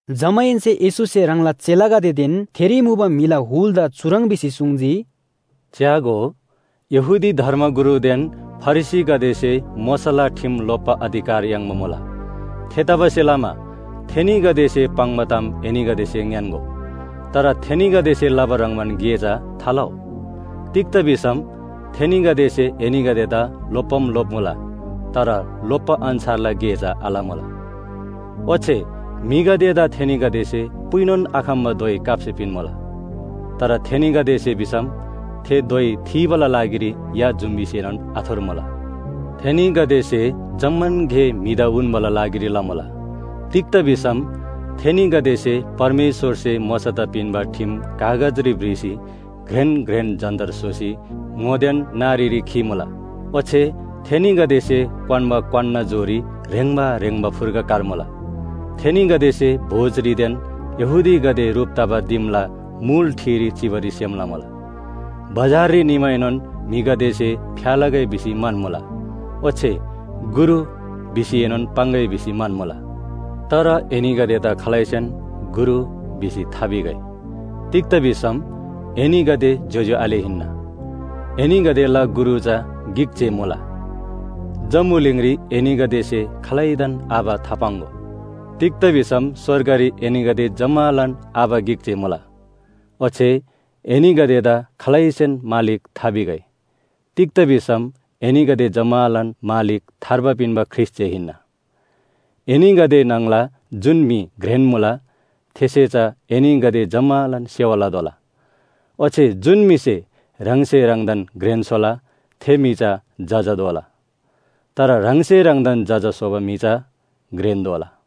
जमाहेन्‍से येशूसे ह्राङला चेलागदेदेन थेरी मुबा म्‍हिला हुलदा चुह्रङ् भिसी सुङ्जी, “च्‍यागो, यहूदी धर्मगुरुदेन फरिसीगदेसे मोशाला ठिम लोप्‍बा अधिकार याङ्बा मुला। थेतबासेलमा थेनीगदेसे पाङ्बा ताम एनीगदेसे ङ्‌यान्‍गो, तर थेनीगदेसे लबा ह्रङ्‌बान गे चा थालउ। तिग्‍दा भिसम थेनीगदेसे एनीगदेदा लोप्‍बाम लोप्‍मुला, तर लोप्‍बा अन्‍छारला गे चा आलमुला। ओच्‍छे म्‍हिगदेदा थेनीगदेसे पुइनोन आखम्‍बा धोइ काप्‍सी पिन्‍मुला। तर थेनीगदेसे भिसम थे धोइ थीबाला लागिरी या जुम्‍बीसेनोन आथुर्मुला। “थेनीगदेसे जम्‍मान गे म्‍हिदा उन्‍बाला लागिरी लमुला। तिग्‍दा भिसम थेनीगदेसे परमेश्‍वरसे मोशादा पिन्‍बा ठिम कागजरी भ्रिसी घ्रेन घ्रेन जन्‍तर स्‍होसी ङोदेन नारीरी खीमुला। ओच्‍छे थेनीगदेसे क्‍वान्‍बा क्‍वान्‍ना जोरी ह्रेङ्बा ह्रेङ्बा फुर्गा कार्मुला। थेनीगदेसे भोजरीदेन यहूदीगदे ह्रुप तबा दिमला मुल ठिरी चिबारी सेम लमुला। बजाररी निमाएनोन म्‍हिगदेसे फ्‍या लगै भिसी म्‍हन्‍मुला, ओच्‍छे ‘गुरु’ भिसीएनोन पाङ्‌गै भिसी म्‍हन्‍मुला। तर एनीगदेदा खालैसेन ‘गुरु’ भिसी थाभिगै। तिग्‍दा भिसम एनीगदे ज्‍योज्‍यो आले हिन्‍ना। एनीगदेला गुरु चा गिक जे मुला। जम्‍बुलिङरी एनीगदेसे खालैदान आबा थापाङ्‍गो। तिग्‍दा भिसम स्‍वर्गरी एनीगदे जम्‍मालान आबा गिक जे मुला। ओच्‍छे एनीगदेदा खालैसेन ‘मालिक’ थाभिगै। तिग्‍दा भिसम एनीगदे जम्‍मालान मालिक थार्बा पिन्‍बा ख्रीष्‍ट जे हिन्‍ना। एनीगदे न्‍हङला जुन म्‍हि घ्रेन मुला, थेसे चा एनीगदे जम्‍मालान सेवा लतोःला। ओच्‍छे जुन म्‍हिसे ह्राङसे ह्राङदान घ्रेन स्‍होला, थे म्‍हि चा जजा दोला। तर ह्राङसे ह्राङदान जजा स्‍होबा म्‍हि चा घ्रेन दोला।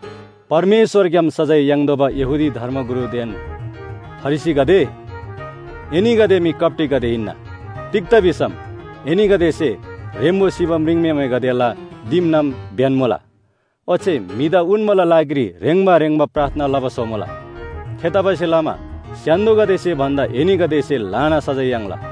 “परमेश्‍वरग्‍याम सजाय याङ्तोःबा यहूदी धर्मगुरुदेन फरिसीगदे, एनीगदे मी कप्‍टीगदे हिन्‍ना। तिग्‍दा भिसम एनीगदेसे ह्रेम्‍बो सिबा म्रिङम्‍हेमेगदेला दिमनाम ब्‍यन्‍मुला। ओच्‍छे म्‍हिदा उन्‍बाला लागिरी ह्रेङ्बा ह्रेङ्बा प्रार्थना लबा स्‍होमुला। थेतबासेलमा स्‍य्‍हान्‍दोगदेसे भन्‍दा एनीगदेसे ल्‍हाना सजाय याङ्ला।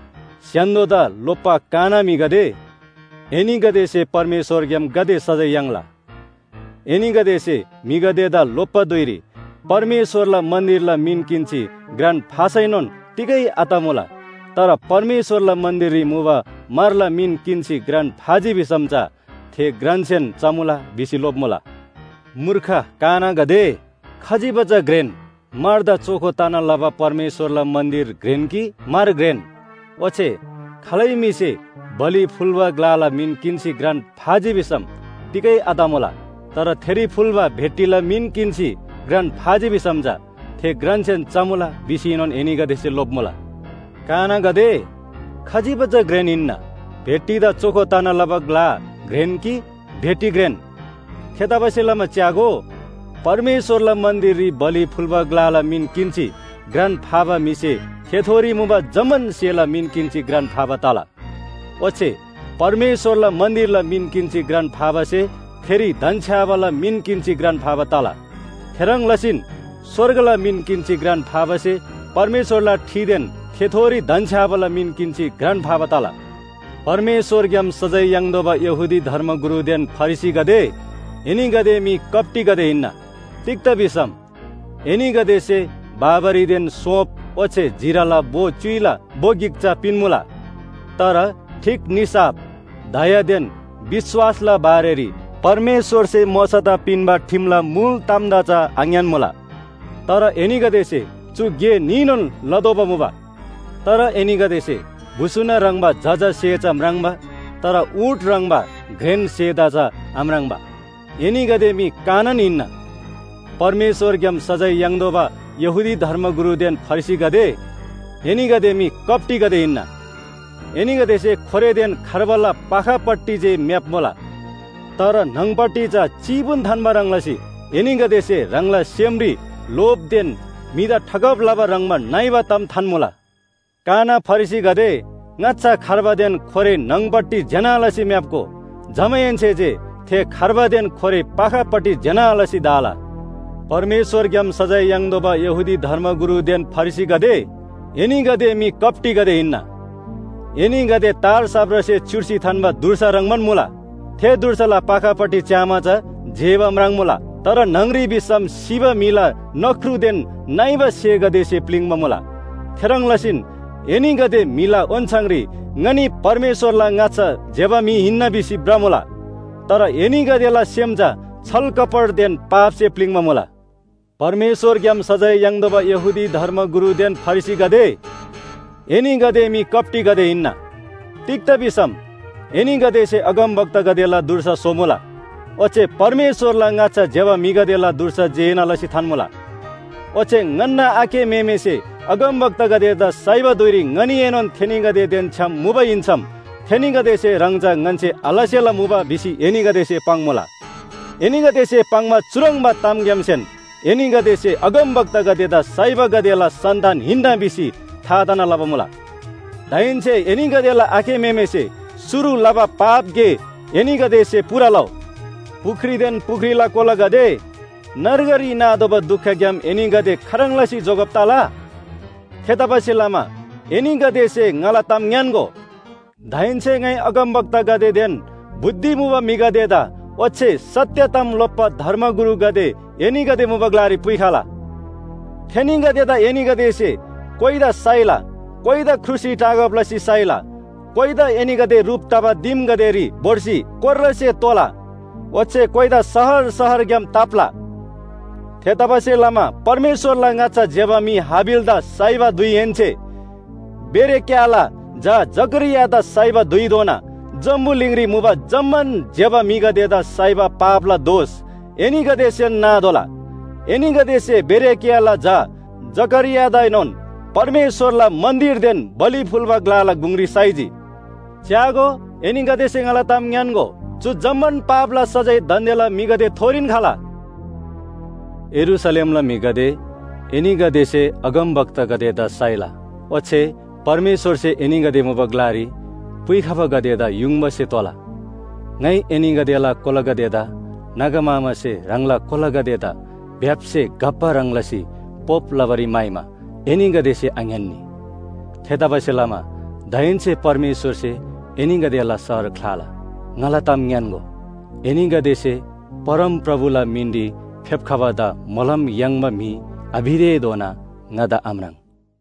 “स्‍य्‍हान्‍दोदा लोप्‍बा काना म्‍हिगदे, एनीगदेसे परमेश्‍वरग्‍याम गाते सजाय याङ्ला। एनीगदेसे म्‍हिगदेदा लोप्‍बा धुइरी ‘परमेश्‍वरला मन्‍दिरला मिन किन्‍सी घ्रान फासैनोन तिगै आतमुला। तर परमेश्‍वरला मन्‍दिररी मुबा म्‍हरला मिन किन्‍सी घ्रान फाजी भिसम चा थे घ्रानसेन चमुला’ भिसी लोप्‍मुला। मूर्ख कानागदे, खजिबा चा घ्रेन? म्‍हरदा चोखो तना लबा परमेश्‍वरला मन्‍दिर घ्रेन कि म्‍हर घ्रेन? ओच्‍छे ‘खालै म्‍हिसे बलि फुल्‍बा ग्‍लाला मिन किन्‍सी घ्रान फाजी भिसम तिगै आतमुला, तर थेरी फुल्‍बा भेटीला मिन किन्‍सी घ्रान फाजी भिसम चा थे घ्रानसेन चमुला’ भिसीनोन एनीगदेसे लोप्‍मुला। कानागदे, खजिबा चा घ्रेन हिन्‍ना। भेटीदा चोखो तना लबा ग्‍ला घ्रेन कि भेटी घ्रेन? थेतबासेलमा च्‍यागो, परमेश्‍वरला मन्‍दिररी बलि फुल्‍बा ग्‍लाला मिन किन्‍सी घ्रान फाबा म्‍हिसे थेथोरी मुबा जम्‍मान स्‍हेला मिन किन्‍सी घ्रान फाबा तला। ओच्‍छे परमेश्‍वरला मन्‍दिरला मिन किन्‍सी घ्रान फाबासे थेरी धन्‍छ्‌याबाला मिन किन्‍सी घ्रान फाबा तला। थेह्रङ् लसीन स्‍वर्गला मिन किन्‍सी घ्रान फाबासे परमेश्‍वरला ठिदेन थेथोरी धन्‍छ्‌याबाला मिन किन्‍सी घ्रान फाबा तला। “परमेश्‍वरग्‍याम सजाय याङ्तोःबा यहूदी धर्मगुरुदेन फरिसीगदे, एनीगदे मी कप्‍टीगदे हिन्‍ना। तिग्‍दा भिसम एनीगदेसे बाबरीदेन सोँप ओच्‍छे जिराला भो च्‍युइला भो गिक चा पिन्‍मुला। तर ठीक निसाफ, दयादेन विश्‍वासला बारेरी परमेश्‍वरसे मोशादा पिन्‍बा ठिमला मुल तामदा चा आङ्‌यान्‍मुला। तर एनीगदेसे चु गे न्‍हीनोन लतोःबा मुबा। तर एनीगदेसे भुसुना ह्रङ्‌बा जजा स्‍हे चा म्राङ्बा, तर ऊँट ह्रङ्‌बा घ्रेन स्‍हेदा चा आम्राङ्बा, एनीगदे मी कानान हिन्‍ना। “परमेश्‍वरग्‍याम सजाय याङ्तोःबा यहूदी धर्मगुरुदेन फरिसीगदे, एनीगदे मी कप्‍टीगदे हिन्‍ना। एनीगदेसे खोरेदेन खार्बाला पाखापट्टि जे म्‍याप्‍मुला। तर न्‍हङपट्टि चा चीबुन थान्‍बा ह्रङ् लसी एनीगदेसे ह्राङला सेमरी लोभदेन म्‍हिदा ठगब लबा ह्रङ्‌बा नइबा ताम थान्‍मुला। काना फरिसीगदे, ङाच्‍छा खार्बादेन खोरे न्‍हङपट्टि ज्‍यना लसी म्‍याप्‍गो। जमाहेन्‍से जे थे खार्बादेन खोरे पाखापट्टि ज्‍यना लसी धा‍ला। “परमेश्‍वरग्‍याम सजाय याङ्तोःबा यहूदी धर्मगुरुदेन फरिसीगदे, एनीगदे मी कप्‍टीगदे हिन्‍ना। एनीगदे तार साप्रासे च्‍युर्सी थान्‍बा धुर्सा ह्रङ्‌बान मुला। थे धुर्साला पाखापट्टि च्‍यामा चा जेबा म्राङ्‌मुला। तर न्‍हङ‍री भिसम सिबा म्‍हिला नख्रुदेन नइबा स्‍हेगदेसे प्‍लिङ्बा मुला। थेह्रङ् लसीन एनीगदे म्‍हिला ओन्‍छाङरी ‘ङनी परमेश्‍वरला ङाच्‍छा ज्‍यबा म्‍हि हिन्‍ना’ भिसी भ्रमुला। तर एनीगदेला सेम चा छलकपटदेन पापसे प्‍लिङ्बा मुला। “परमेश्‍वरग्‍याम सजाय याङ्तोःबा यहूदी धर्मगुरुदेन फरिसीगदे, एनीगदे मी कप्‍टीगदे हिन्‍ना। तिग्‍दा भिसम एनीगदेसे अगमवक्तागदेला धुर्सा स्‍होमुला, ओच्‍छे परमेश्‍वरला ङाच्‍छा ज्‍यबा म्‍हिगदेला धुर्सा जेना लसी थान्‍मुला। ओच्‍छे ‘ङन्‍ना आखे म्‍हेमेसे अगमवक्तागदेदा साइबा धुइरी ङनीएनोन थेनीगदेदेन छ्‌याम मुबा हिन्‍सम थेनीगदेसे ह्रङ् चा ङन्‍से आलसेला मुबा’ भिसी एनीगदेसे पाङ्‌मुला। एनीगदेसे पाङ्बा चुह्रङ्बा तामग्‍यामसेन एनीगदे अगमवक्तागदेदा साइबागदेला सन्‍तान हिन्‍ना भिसी था तना लबा मुला। दाहेन्‍से एनीगदेला आखे म्‍हेमेसे शुरु लबा पाप गे एनीगदेसे पूरा लउ। “पुख्रीदेन पुख्रीला कोलागदे, नर्गरी नातोःबा दुखग्‍याम एनीगदे खाह्रङ् लसी जोगब तला? थेतबासेलमा एनीगदेसे ङाला ताम ङ्‌यान्‍गो, दाहेन्‍से ङाइ अगमवक्तागदेदेन बुद्धि मुबा म्‍हिगदेदा ओच्‍छे सत्‍य ताम लोप्‍बा धर्मगुरुगदे एनीगदे मुबा ग्‍लारी पुइखला। थेनीगदेदा एनीगदेसे कोइदा साइला, कोइदा क्रुसरी टाँगब लसी साइला, कोइदा एनीगदे ह्रुप तबा दिमगदेरी भोर्सी कोर्रासे तोःला ओच्‍छे कोइदा शहर शहरग्‍याम ताप्‍ला। थेतबासेलमा परमेश्‍वरला ङाच्‍छा ज्‍यबा म्‍हि हाबिलदा साइबा धुइहेन्‍से बेरेक्‍याहला झा जकरियादा साइबा धुइधोना जम्‍बुलिङरी मुबा जम्‍मान ज्‍यबा म्‍हिगदेदा साइबा पापला दोष एनीगदेसेन नातोःला। एनीगदेसे बेरेक्‍याहला झा जकरियादाएनोन परमेश्‍वरला मन्‍दिरदेन बलि फुल्‍बा ग्‍लाला गुङरी साइजी। च्‍यागो, एनीगदेसे ङाला ताम ङ्‌यान्‍गो, चु जम्‍मान पापला सजाय दान्‍देला म्‍हिगदेथोरीन खला। “यरूशलेमला म्‍हिगदे, एनीगदेसे अगमवक्तागदेदा साइला ओच्‍छे परमेश्‍वरसे एनीगदे मुबा ग्‍लारी पुइखबागदेदा युङबासे तोला। ङाइ एनीगदेला कोलागदेदा नागा मामासे ह्राङला कोलागदेदा भ्‍याप्‍से घप्‍बा ह्रङ् लसी पोप लबारी म्‍हाइमा एनीगदेसे आङ्‌यान्‍नी। थेतबासेलमा दाहेन्‍से परमेश्‍वरसे एनीगदेला शहर ख्‍लाला। ङाला ताम ङ्‌यान्‍गो, एनीगदेसे ‘परमप्रभुला मिनरी फेप्‍खबादा मोलम याङ्बा म्‍हि’ आभितेधोना ङादा आम्राङ्।”